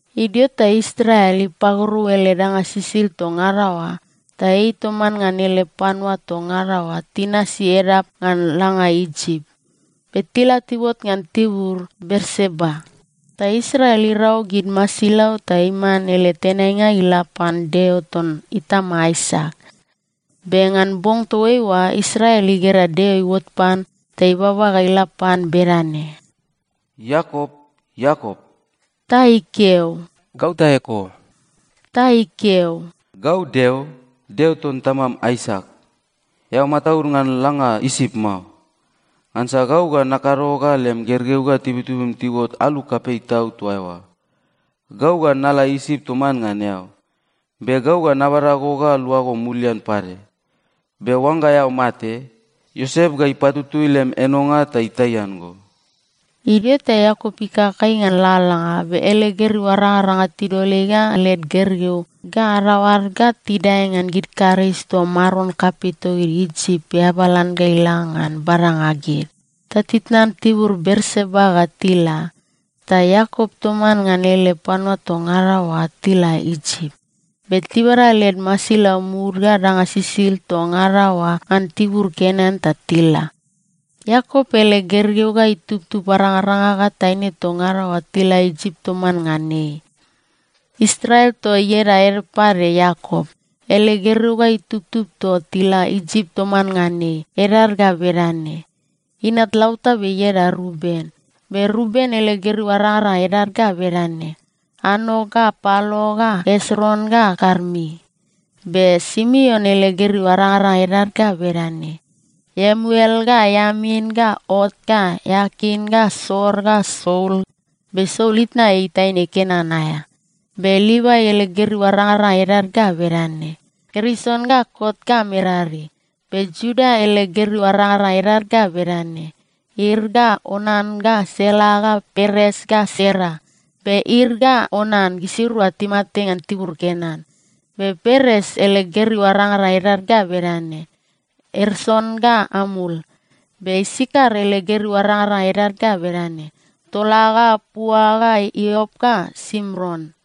Idio ta Israel ipagorou ele danga sisid toa ngada oa, ta ei toman ngan ele panua toa ngada oa tinasi edap ngan langa Isip. Be tila tiuot ngan tibur Berseba, ta Israel irau gid masilau ta iman ele tenainga ga ila pan Deo ton itama Aisak. Be ngan bong toaiua, Israel igera Deo iuot pan ta ibaba ga ila pan bedane, “Iakop, Iakop!” Ta ikeo, “Gau ta eko.” Ta ikeo, “Gau Deo, Deo ton tamam Aisak. Eao mataud ngan langa Isip mao. Ngansa gau ga nakado ga lem gergeu ga tibutibum tiuot alu kapei tau toa eoa. Gau ga nala Isip toman ngan eao, be gau ga nabada go ga luago mulian pade. Be oangga eao mate, Iosep ga ipatutui lem enonga ta itaian go.” Idio ta Iakop ikakai ngan lalalanga, be ele gergeu arangaranga tidol ei ga led gergeu ga adadaoad ta tidae ngan gid karis toa maron kapei togid Isip iabalan ga ila ngan badanga gid, ta titnan tibur Berseba ga tila. Ta Iakop toman ngan ele panua toa ngada oa tila Isip. Be tibada led masilau mud ga danga sisid toa ngada oa ngan tibur Kenan ta tila. Iakop ele gergeu ga itubtub arangaranga ga taine toa ngada oa tila Isip toman ngan ei. Israel, toa ieda ede pade Iakop, ele gergeu ga itubtub toa tila Isip toman ngan ei, edad ga bedane: Inat lautabe ieda Ruben. Be Ruben ele gergeu arangaranga edad ga bedane: Anok ga Palu ga Esron ga Karmi. Be Simeon ele gergeu arangaranga edad ga bedane: Iemuel ga Iamin ga Oat ga Iakin ga Soar ga Saul. Be Saul itna ei taine Kenan aea. Be Livai ele gergeu arangaranga edad ga bedane: Gerson ga Koat ga Merari. Be Iuda ele gergeu arangaranga edad ga bedane: Er ga Onan ga Sela ga Peres ga Sera. Be Er ga Onan gisirua timate ngan tibur Kenan. Be Peres ele gergeu arangaranga edad ga bedane: Esron ga Amul. Be Isakar ele gergeu arangaranga edad ga bedane: Tola ga Pua ga Iop ga Simron.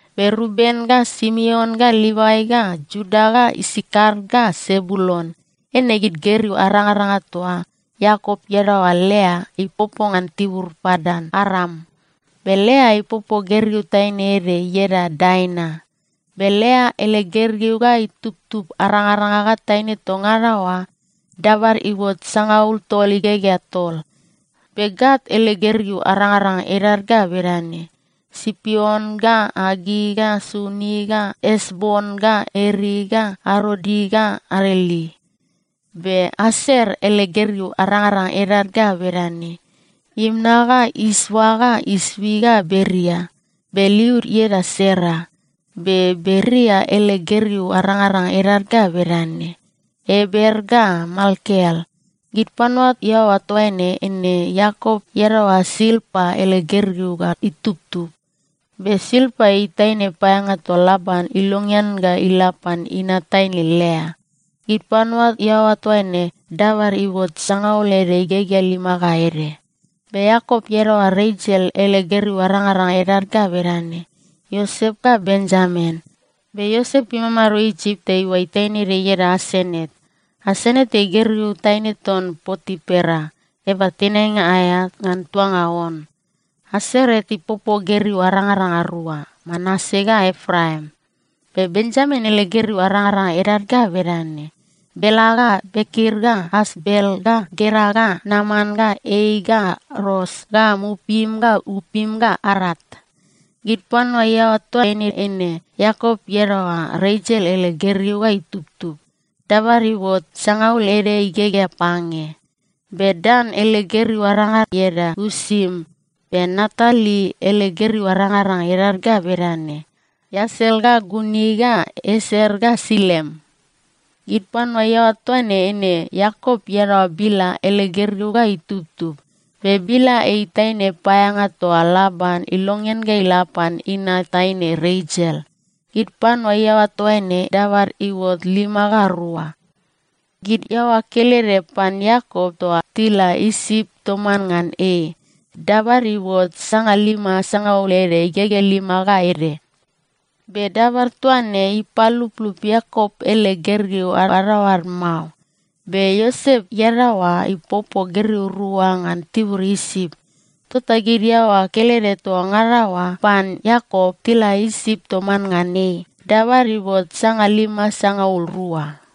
Be Ruben ga Simeon ga Livai ga Iuda ga Isakar ga Sebulun, eine gid gergeu arangaranga toa Iakop iadaoa Lea ipopo ngan tibur Padan-Aram. Be Lea ipopo gergeu taine ede ieda Daina. Be Lea ele gergeu ga itubtub arangaranga ga taine toa ngada oa dabad iuot sangaul tol igegea tol. Be Gat ele gergeu arangaranga edad ga bedane: Sipion ga Agi ga Suni ga Esbon ga Eri ga Arodi ga Areli. Be Aser ele gergeu arangaranga edad ga bedane: Imna ga Isva ga Isvi ga Beria. Be liud ieda Sera. Be Beria ele gergeu arangaranga edad ga bedane: Eber ga Malkiel. Gid panua iaoa toaine, eine Iakop iadaoa Silpa ele gergeu ga itubtub. Be Silpa ei taine paeaeanga toa Laban ilongean ga ila pan inat taine Lea. Gid panua iaoa toaine dabad iuot sangaul ede igegea lima ga ede. Be Iakop iadaoa Resel ele gergeu arangaranga edad ga bedane: Iosep ga Benjamin. Be Iosep imamado Isip ta iuai taine ede ieda Asenat. (Asenat ei gergeu taine ton Potipera, eaba tenainga aea ngan tuanga On.) Asenat ipopo gergeu arangaranga rua, Manase ga Epraim. Be Benjamin ele gergeu arangaranga edad ga bedane: Bela ga Beker ga Asbel ga Gera ga Naman ga Ei ga Ros ga Mupim ga Upim ga Art. Gid panua iaoa toaine, eine Iakop iadaoa Resel ele gergeu ga itubtub. Dabad iuot sangaul ede igegea pange. Be Dan ele gergeu aranga ieda Usim. Be Naptali ele gergeu arangaranga edad ga bedane: Iasel ga Guni ga Ieser ga Silem. Gid panua iaoa toaine, eine Iakop iadaoa Bila ele gergeu ga itubtub. Be Bila ei taine paeaeanga toa Laban ilongean ga ila pan inat taine Resel. Gid panua iaoa toaine dabad iuot lima ga rua. Gid iaoa kelede pan Iakop toa tila Isip toman ngan ei, dabad iuot sangalima sangaul ede igegea lima ga ede. Be dabad toa ne ipaluplup Iakop ele gergeu adadaoad mao. Be Iosep iadaoa ipopo gergeu rua ngan tibur Isip. Tota gid iaoa kelede toa ngada oa pan Iakop tila Isip toman ngan ei, dabad iuot sangalima sangaul rua.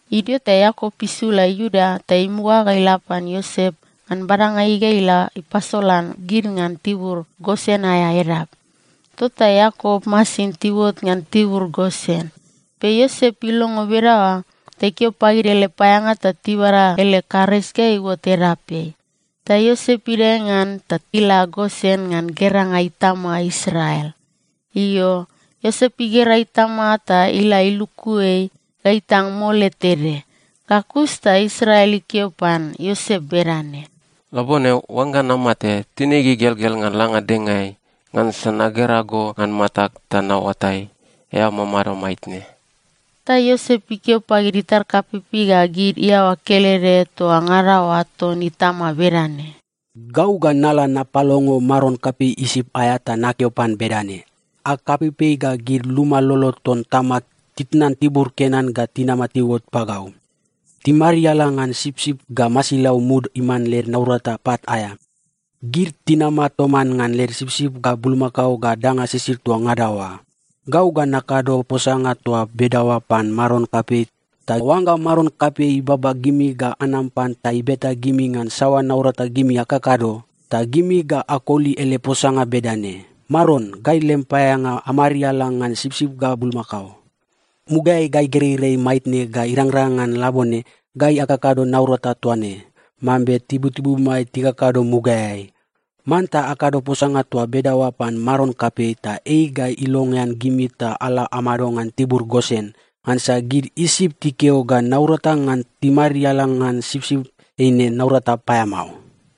Idio ta Iakop isula Iuda ta imuga ga ila pan Iosep ngan badanga ei ga ila ipasolan gid ngan tibur Gosen aea edap. Tota Iakop masin tiuot ngan tibur Gosen, be Iosep ilongo bedaoa ta ikeo pagid ele paeaeanga ta tibada ele karis ga iuot edapeai. Ta Iosep idae ngan ta ila Gosen ngan geranga itama Israel. Io, Iosep igera itama ta ila iluku ei ga itang mole tede. Ga kus ta Israel ikeo pan Iosep bedane, “Labone, oangga namate, tinig igelgel ngan langa dengaeai, ngansa nagera go ngan matag ta naoatai, eao mamado maitne.” Ta Iosep ikeo pagid itar kapeipei ga gid iaoa kelede toa ngada oa ton itama bedane, “Gau ga nala napalongo maron kapei Isip aea ta nakeo pan bedane, ‘Ag kapeipei ga gid luma lolo ton tamag titnan tibur Kenan ga tinam tiuot pagau. Timariala ngan sipsip ga masilau mud iman led naurata pat aea. Gid tinama toman ngan led sipsip ga bulmakao ga danga sisid toa ngada oa.’ Gau ga nakado posanga toa bedaoa pan maron kapei, ta oangga maron kapei ibaba gimi ga anam pan ta ibeta gimi ngan saoa naurata gimi akakado, ta gimi ga akoli ele posanga bedane, ‘Maron, gai lem paeaeanga amariala ngan sipsip ga bulmakao. Mugaeai gai gereirei maitne ga irangrang ngan labone, gai akakado naurata toa ne, mambe tibutibumai tikakado mugaeai.’ Manta akado posanga toa bedaoa pan maron kapei, ta ei ga ilongean gimi ta ala amado ngan tibur Gosen. Ngansa gid Isip tikeo ga naurata ngan timariala ngan sipsip eine naurata paeamao.”